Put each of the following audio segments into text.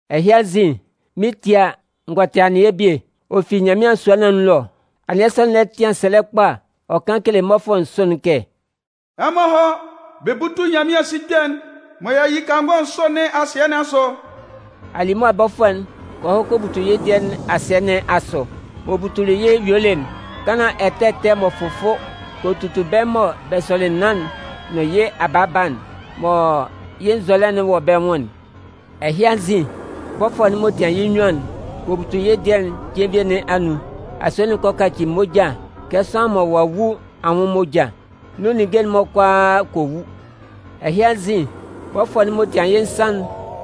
Ɛhɩ anzin, mɩn 'tie a, n gɔ tɩ anɩɛ bie, ɔ fi Nyanmɩan sua nɩn anun ɛlɔ. Anɩɛ sɔ'n lɛ tɩan sɛlɛ kpa ɔ kan kele mmɔfʋɛ nsʋ'n kɛ: “Ɛmɔ hɔ́ bɛ bútu Nyanmɩan sikpɛ'n m'ɔ yi kangɔ nsʋ nɩn asɩɛ nɩn asʋ!” Alimʋa bɔfʋɛ'n kɔ hɔ kɔ butu yɩ́ dɩɛ nɩn asɩɛ nɩn asʋ. M'ɔ butuli yɩ́ yuelɩ'n, kanlan ɛtɛ ɛtɛ m'ɔ fʋfʋ kɔ tutu bɛ́ mɔ bɛ sʋlɩ naan'n nʋn yɩ́ abaaba'n, mɔ yɩ́ nzɔlɛ'n wɔ bɛ nwʋn'n. Ɛhɩ anzin, bɔfʋɛ'n m'ɔ tian yɩ́ nnyuan'n kɔ butu yɩ́ dɩɛ'n jenvie nɩn anun. Asue'n kɔ kaci moja kɛ sʋanlan mɔ ɔ'a wu anwʋn moja. Nun ninnge'n-mɔ kʋalaa kɔ wu. Ɛhɩ anzin, bɔfʋɛ'n m'ɔ tian yɩ́ nsan'n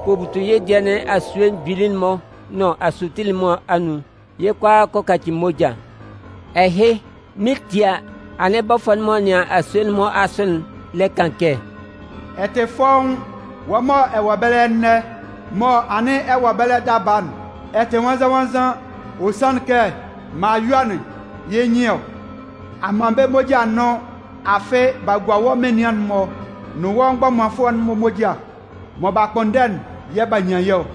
kɔ butu yɩ́ dɩɛ nɩn asue mgbili'n-mɔ nʋn asutile'n-mɔ anun. Yɩ́ kʋalaa kɔ kaci moja. Ɛhɩ, mɩn 'tie a, anɩn bɔfʋɛ'n m'ɔ nɩan asue'n-mɔ asʋ'n lɛ kan kɛ: “Ɛ tɩ fɔ́ʋ́n, wɔ́ mɔ ɛ wɔ ɛbɛlɛ ɛnɛ, mɔ anɩn ɛ wɔ ɛbɛlɛ daba'n. Ɛ tɩ nwannzan-nwannzan. Ɔ sanlɩn kɛ, mɔ a yɔ'n, yɩ́ nyɩn ɔ. A man bɛ́ moja a nʋn, afɩ b'a gua wɔ́ menian'n-mɔ nʋn wɔ́ mgbɔmanfʋɛ'n-mɔ moja. Mɔ b'a kpʋnndɛ'n yɛ̂ b'a nyan yɩ́ ɔ.”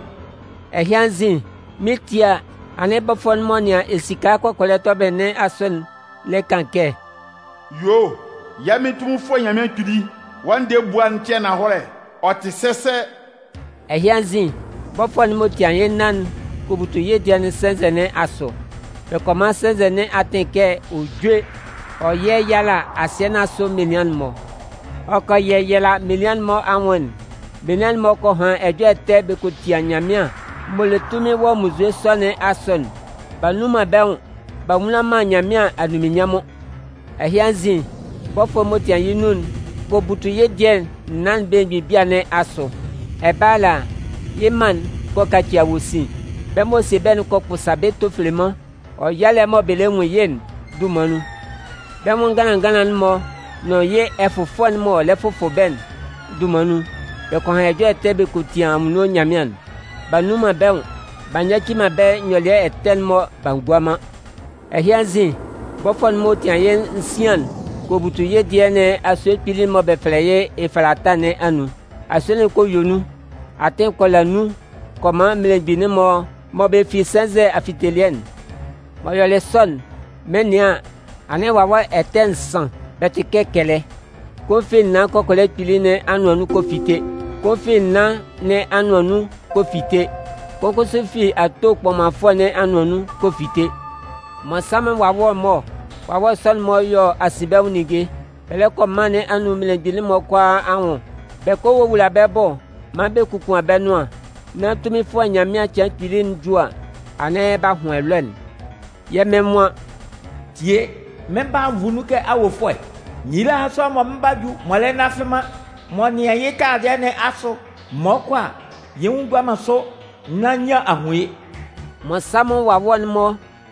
Ɛhɩ anzin, mɩn 'tie a, anɩn bɔfʋɛ'n m'ɔ nɩan esika kɔkɔlɛ tɔbɩlɩ nɩn asʋ'n lɛ kan kɛ: “Yuo, yɛ́ Mɩn Tunminfʋɛ Nyanmɩan Kpili, wɔ́ ndɛɛ ebua'n tɩ ananhɔlɛ, ɔ tɩ sɛsɛ.” Ɛhɩ anzin, bɔfʋɛ'n m'ɔ tian yɩ́ nnan'n kɔ butu yɩ́ dɩɛ'n sɛnzɛ nɩn asʋ. Bɛ kɔ man sɛnzɛ nɩn atɩn kɛ ɔ júe ɔ yɛ́yala asɩɛ nɩn asʋ menian'n-mɔ. Ɔ kɔ yɛyala menian'n-mɔ anwʋn'n. Menian'n-mɔ kɔ han ɛjɔlɛ ɛtɛ bɛ kɔ tia Nyanmɩan m'ɔ le tunmin wɔ munnzue sɔ nɩn asʋ'n. B'a nnun man bɛ́ nwʋn b'a nwula man Nyanmɩan anunminnyanmʋn. Ɛhɩ anzin, bɔfʋɛ'n m'ɔ tian yɩ́ nnun'n kɔ butu yɩ́ dɩɛ'n naan'n belemgbin bia nɩn asʋ. Ɛbɛlɛ ala, yɩ́ mân'n kɔ kaci awosin. Bɛ́ m'ɔ sie bɛ́'n kɔ kpʋsa bɛ́ tofeleman wɔ yalɛ'n mɔ bɛ lɛ nwun yɩ́'n dunman nun. Bɛ́ nwʋn nganlan nganlan'n-mɔ nʋn yɩ́ ɛfʋfʋɛ'n m'ɔ lɛ fʋfʋ bɛ́'n dunman nun, bɛ kɔ han ɛjɔlɛ ɛtɛ bɛ kɔ tia Anwunno Nyanmɩan'n. B'a nnun man bɛ́ nwʋn b'a nyaci man bɛ́ nyɔlɩɛ ɛtɛ'n-mɔ b'a ngua man. Ɛhɩ anzin, bɔfʋɛ'n m'ɔ tian yɩ́ nsian'n, kɔ butu yɩ́ dɩɛ nɩn asue kpili'n mɔ bɛ fɛlɛ yɩ́ Efalatɩ nɩn anun. Asue'n kɔ yue nun. Atɩn kɔ la nun kɔ man mmelemgbin'n-mɔ mɔ bɛ fi sɛnzɛ afitelɩɛ'n. M'ɔ yɔlɩ sɔ'n, mɩn 'nɩan an, anɩn wawɛ ɛtɛ nsan, bɛ tɩ kɛ kɛlɛ. Kʋn fi naan kɔkɔlɛ kpili nɩn anʋan nun kɛ fite. Kʋn fi naan nɩn anʋan nun kɔ fite. Kʋn kʋsʋ fi ato kpɔmanfʋɛ nɩn anʋan nun kɔ fite. Mmɔnsanmʋn wawɛ-mɔ ɔ. Wawɛ sɔ'n-mɔ yɔ asinbɛnwʋn ninnge. Bɛ lɛ kɔ mân nɩn anun mmelemgbin'n-mɔ kʋalaa anwʋn bɛ kɔ wowula bɛ́ bʋ maan bɛ kokuan bɛ́ nʋan, nán Tunminfʋɛ Nyanmɩan cɩan kpili'n ju a, anɩn b'a hʋn ɛlɔɛ'n. Yɛ́ Mɩn nwan: “Tie, mɩn 'ba a nvu nun kɛ awofʋɛ. Nyila hán sʋanlan mɔ mɩn 'ba ju mɔ ɔ lɛ nnafɩ man, m'ɔ nɩan yɩ́ taladɩɛ nɩn asʋ, mɔ ɔ 'kɔ a, yɩ́ nwʋn gua man sʋ nán nyian a hun yɩ́.” Mmɔnsanmʋn wawɛ'n-mɔ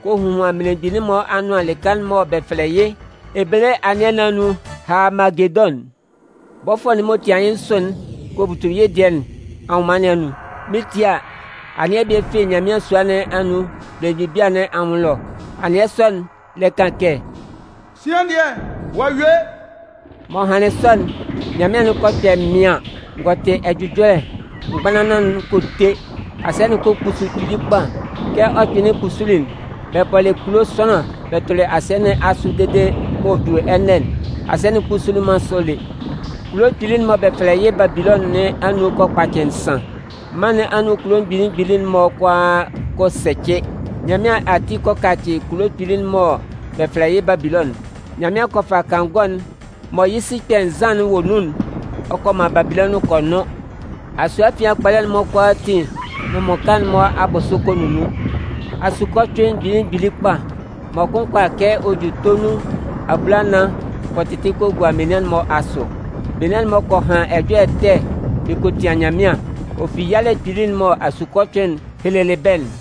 kɔ hohuan mmelemgbin'n-mɔ anʋan lɩka'n mɔ bɛ fɛlɛ yɩ́ ebele anɩɛ nɩn anun Haamagedʋn'n. Bɔfʋɛ'n m'ɔ tian yɩ́ nsʋ'n kɔ butu yɩ́ dɩɛ nɩn anwʋnman nɩn anun. Mɩn 'tie a, anɩɛ bie fi Nyanmɩan sua nɩn anun belemgbin bia nɩn anwʋn ɛlɔ. Anɩɛ sɔ'n, lɛ kan kɛ: “Sian dɩɛ, ɔ'a yue!” M'ɔ hanlɩn sɔ'n, nyanmɩan'n kɔ kpɛ mɩaɩn, n gɔ tɩ ɛjʋjɔlɛ, mgbanlanlan'n kɔ te. Asɩɛ'n kɔ kpusu kpili kpa. Kɛ ɔ kpɩnlɩn kpusuli'n, bɛ bɔlɩ kulo sʋanlan bɛ tʋlɩ asɩɛ nɩn asʋ dede mɔ ɔ 'ju ɛnɛ'n, asɩɛ'n kpusulɩ man sɔ lé. Kulo kpili'n mɔ bɛ fɛlɛ yɩ́ Babilɔnʋn nɩn anun kɔ kpacɩ nsan. Mân nɩn anun kulo mgbili mgbili'n-mɔ kʋalaa kɔ sɛcɩ. Nyanmɩan ati kɔ kacɩ kulo kpili'n mɔ bɛ fɛlɛ yɩ́ Babilɔnʋn'n. Nyanmɩan kɔ fa kangɔ'n mɔ yɩ́ sikpɛ nzan'n wɔ nun'n ɔ kɔ man Babilɔnʋn kɔ nʋn. Asue afian kpɔlɛ'n-mɔ kʋalaatin nʋn mmʋka'n-mɔ abʋsʋ kɔ nunnun. Asukɔcʋɩn mgbili mgbili kpa, mɔ kʋn kʋala kɛ ɔ ju tonun abulanan kɔ tɩtɩ kɔ gua menian'n-mɔ asʋ. Menian'n-mɔ kɔ han ɛjɔlɛ ɛtɛ bɛ kɔ tia Nyanmɩan, ɔ fi yalɛ kpili'n mɔ asukɔcʋɩn'n helelɩ bɛ́'n.